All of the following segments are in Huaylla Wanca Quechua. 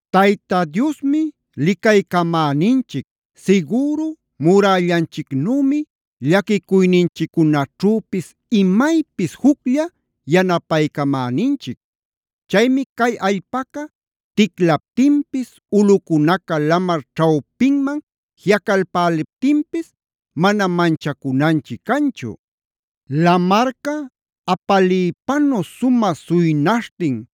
Tayta Diosmi licaycamäninchic, sigüru murällanchicnümi, llaquicuyninchiccunaćhüpis imaypis juclla yanapaycamäninchic. Chaymi cay allpaca ticlaptinpis, ulꞌucunaca lamar ćhawpinman jiꞌacalpäliptinpis mana manchacunanchic canchu. Lamarca apaliypanu sumä suynaśhtin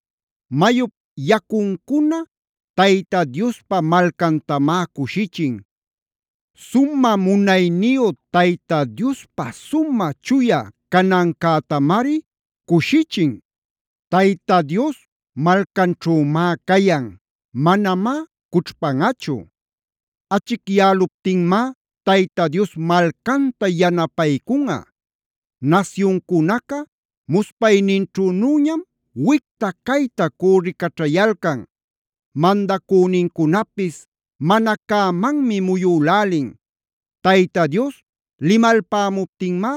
Mayup yacuncuna Tayta Diospa malcantamá cushichin.c Sumä munayniyu Tayta Diospä sumä chuya canancätamari cushichin. Tayta Dios malcanćhümá cayan. Manamá cućhpanꞌachu. Achicyäluptinmá Tayta Dios malcanta yanapaycunꞌa. Nasyuncunaca muspayninćhünüñam wicta-cayta cürricaćhayalcan. Mandacünincunapis mana cämanmi muyülälin. Tayta Dios limalpämuptinmá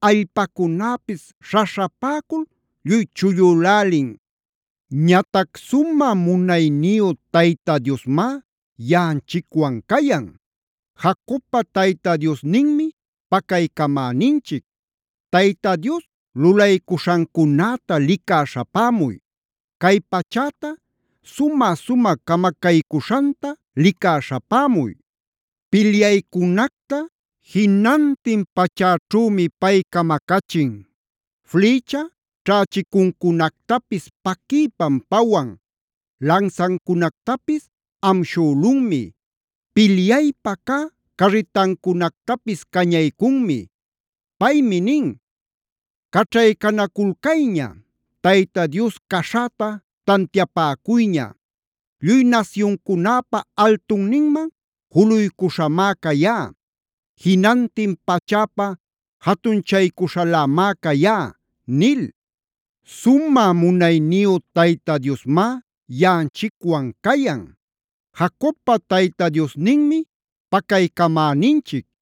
allpacunäpis śhaśhapäcul lluy chullülälin. Ñatac ¡sumä munayniyu Tayta Diosmá yaꞌanchicwan cayan! ¡Jacobpa Tayta Diosninmi pacaycamäninchic! Tayta Dios lulaycuśhancunäta licä śhapämuy. Cay pachäta sumä-sumä camacaycuśhanta licä śhapämuy. Pilyaycunacta jinantin pachäćhümi pay camacachin. Flïcha ćhächicuncunactapis paquiypam pawan. Lansancunactapis amshülunmi. Pilyaypä cä carritancunactapis cañaycunmi. Paymi nin: “¡Caćhaycanaculcayña! ¡Tayta Dios caśhäta tantiapäcuyña! Lluy nasyuncunäpa altunninman juluycuśhamá cayá. Jinantin pachäpa jatunchaycuśhalämá cayá” nil. ¡Sumä munayniyu Tayta Diosmá yaꞌanchicwan cayan! ¡Jacobpa Tayta Diosninmi pacaycamäninchic!